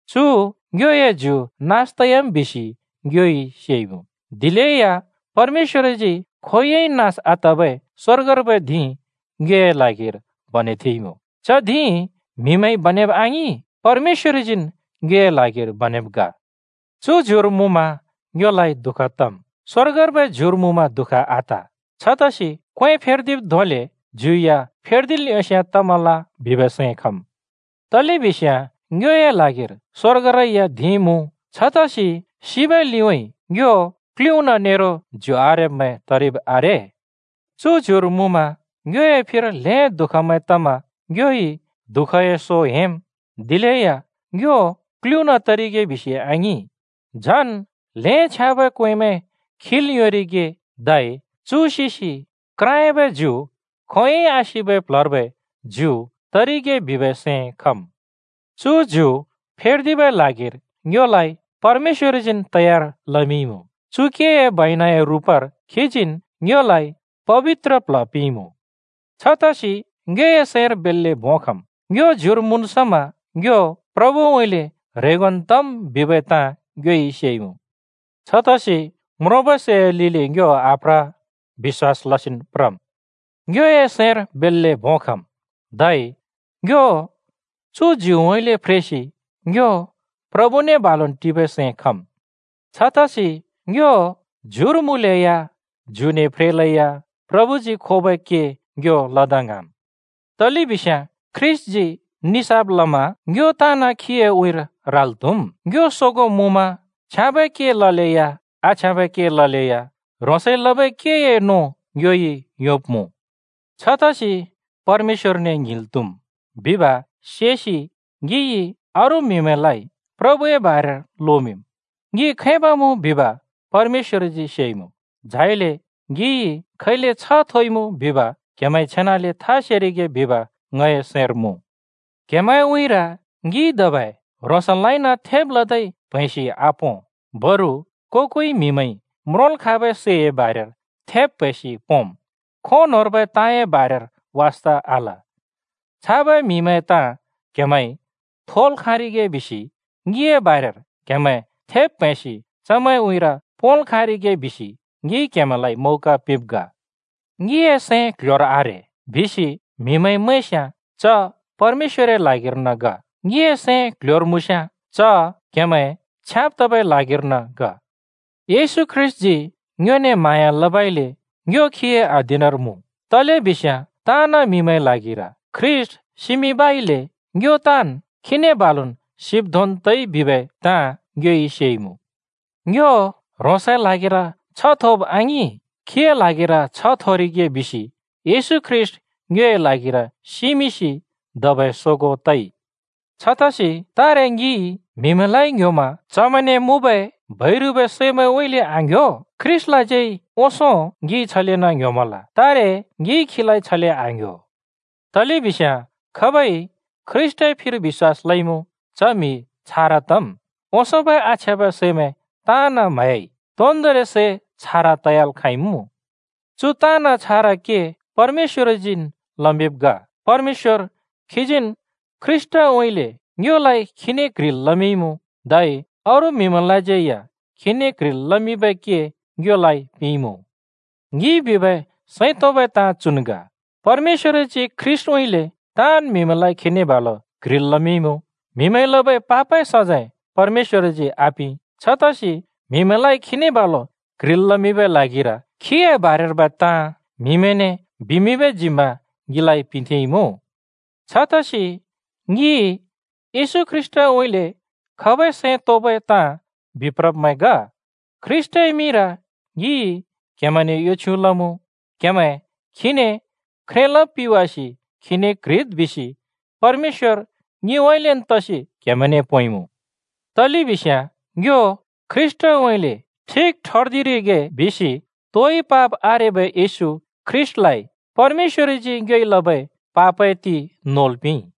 चु ङ्योए ज्यु नास तयाम् बिसि ङ्योइ सेइमुँ। दिलेया परमेश्‍वरजी खोंयोंइ नास आतबै स्‍वर्गर्बै धिं ङ्योए ल्हागिर बनेथेंइमुँ। च धिं म्‍हिमैंइ बनेब आङिं, परमेश्‍वरजीन् ङ्योए ल्हागिर बनेमिंब् ग। चु ज्युर मुँमा ङ्योलाइ दुःख तम्, स्वर्गर्बै ज्युर मुँमा दुःख आत। छतसि क्वें फेर्दिब् धोंलेन् ज्यु या फेर्दिल् योंस्याँ तमल बिबै सैं खम्। तलेबिस्याँ ङ्योए ल्हागिर स्वर्गरै या धिं मुँ। छतसि सिबै लिउँइँ ङ्यो क्लुना नेरो ज्यु आरेब्मैं तरिब् आरे। चु ज्युर मुँमा ङ्योए फिर ल्हें दुःखमैं तमा ङ्योइ दुःखए सो हेंम्। दिलेया ङ्यो क्लुना तरिगे बिसि आङिं, झन ल्हें छ्याँबै क्वेंमैं खिल् योंरिगे, धै चु सिसि क्राँयाबै ज्यु खोंयोंइ आसिबै प्ल्हर्बै ज्यु तरिगे बिबै सैं खम्। चु ज्यु फेर्दिबै ल्हागिर ङ्योलाइ परमेश्‍वरजीन् तयार लमिंइमुँ। चु केए बैनाए रुपर खीजीन् ङ्योलाइ पबित्र प्ल्ह पिंइमुँ। छतसि ङ्योए सैंर बेल्‍ले भों खम्। ङ्यो ज्युर मुँन् समा ङ्यो प्रभुउँइँले ह्रेंगोन् तम् बिबै ताँ ङ्योइ सेइमुँ। छतसि म्रोंबै सैए लिलि ङ्यो आप्रा, बिश्‍वास लसिन् प्रम्। ङ्योए सैंर बेल्‍ले भों खम्, धै ङ्यो चु ज्युउँइँले फ्रेसि ङ्यो प्रभुने बालुन् टिबै सैं खम्। छतसि ङ्यो ज्युर मुँलेया, ज्युने फ्रेलेया प्रभुजी खोबै के ङ्यो लदा ङ्हाँम्। तलेबिस्याँ ख्रीष्‍टजी निसाफ लमा ङ्यो ताँन् खीए उँइँर राल् त्‍हुम्। ङ्यो सोगों मुँमा छ्याँबै के ललेया, आछ्याँबै के ललेया ह्रोंसइ लबै केए नों ङ्योइ योंब्‍मुँ। छतसि परमेश्‍वरने ङ्हिंल् त्हुम् बिब् सेसि ङिइ अरू म्‍हिमैंलाइ प्रभुए बारेर लोमिंम्। ङि खैब मुँ बिब परमेश्‍वरजी सेइमुँ, झाइले ङिइ खैले छ्ह थोइमुँ बिब क्‍हेमैंइ छेनाले था सेरिगे बिब ङए सैंर मुँ। क्हेमैंए उँइँर ङिइ धबै ह्रोंसलाइन थेब् लदै प्‍हैंसि आपों, बरु को-कोइ म्हिमैंइ म्रोंल् खाँबै सैए बारेर थेब् प्हैंसि पोंम्, खों न्होंर्बै ताँए बारेर वास्ता आल। छाबै म्हिमैंए ताँ क्हेमैंइ थोल् खाँरिगे बिसि ङिए बारेर क्हेमैं थेब प्हैंसि चमैंए उँइँर पोंल् योंरिगे बिसि ङिइ क्‍हेमैंलाइ मौका पिंब् ग। “ङिए सैं क्ल्ह्‍योर आरे,” बिसि म्हिमैंइ मैंस्याँ च परमेश्‍वरए ल्हागिर्न ग। ङिए सैं क्ल्ह्‍योर मुँस्‍याँ, च क्‍हेमैं छ्याँब् तबै ल्हागिर्न ग। येशू ख्रीष्‍टजी ङ्योने म्हाँया लबइले ङ्यो खीए अधीनर मुँ, तलेबिस्याँ ताँन् म्‍हिमैंए ल्हागिर ख्रीष्‍ट सिमिंबइले ङ्यो ताँन् खीने बालुन् सिब् धोंन् तइ बिबै ताँ ङ्योइ सेइमुँ। ङ्यो ह्रोंसए ल्हागिर छ्ह थोब आङिं, खीए ल्हागिर छ्ह थोरिगे बिसि येशू ख्रीष्‍ट ङ्योए ल्हागिर सिमिंसि धबै सोगों तइ। छतसि तारे ङिइ म्हिमैंलाइ ङ्ह्‍योमा चमैंने मुँबै बैरुबै सैमैंउँइँले आङ्ह्‍यो। ख्रीष्‍टलाज्यै ओंसों ङिइ छलेन् ङ्ह्‍योमल, तारे ङिइ खीलाइ छले आङ्ह्‍यो। तलेबिस्याँ खाबइ ख्रीष्‍टए फिर बिश्‍वास लइमुँ च म्‍हि छारा तम्। ओंसोंबै आछ्याँबै सैमैं ताँन् म्हह्‍याइ, तोन्‍दोंरि सै छारा तयाल् खाँइमुँ। चु ताँन् छारा के परमेश्‍वरजीन् लमिंब् ग। परमेश्‍वर खीजीन् ख्रीष्‍टउँइँले ङ्योलाइ खीने क्ह्रिल् लमिंइमुँ, धै अरू म्हिमैंलाज्यै या खीने क्ह्रिल् लमिंबै के ङ्योलाइ पिंइमुँ। ङिइ बिबै सैं तोंबै ताँ चुन् ग: परमेश्‍वरजी ख्रीष्‍टउँइँले ताँन् म्‍हिमैंलाइ खीने बालु क्ह्रिल् लमिंइमुँ। म्‍हिमैंइ लबै पापए सजैं परमेश्‍वरजी आपिं। छतसि म्‍हिमैंलाइ खीने बालु क्ह्रिल् लमिंबै ल्हागिर खीए बारेर्बै ताँ म्हिमैंने बिमिंबै जिम्‍मा ङिलाइ पिंथेंइमुँ। छतसि ङि येशू ख्रीष्‍टउँइँले खबै सैं तोंबै ताँ बिप्रब्‍मैं ग। ख्रीष्‍टए मिंर ङिइ क्हेमैंने यो छ्युँ लमुँ। क्हेमैं खीने ख्रे लब् पिवासि खीने क्ह्रिद् बिसि परमेश्‍वर ङिउँइँलेन् तसि क्हेमैंने पोंइमुँ। तलेबिस्याँ ङ्यो ख्रीष्‍टउँइँले ठिक ठर्दिरिगे बिसि तोइ पाप आरेबै येशू ख्रीष्‍टलाइ परमेश्‍वरजी ङ्योइ लबै पापए ति नोल् पिंइ।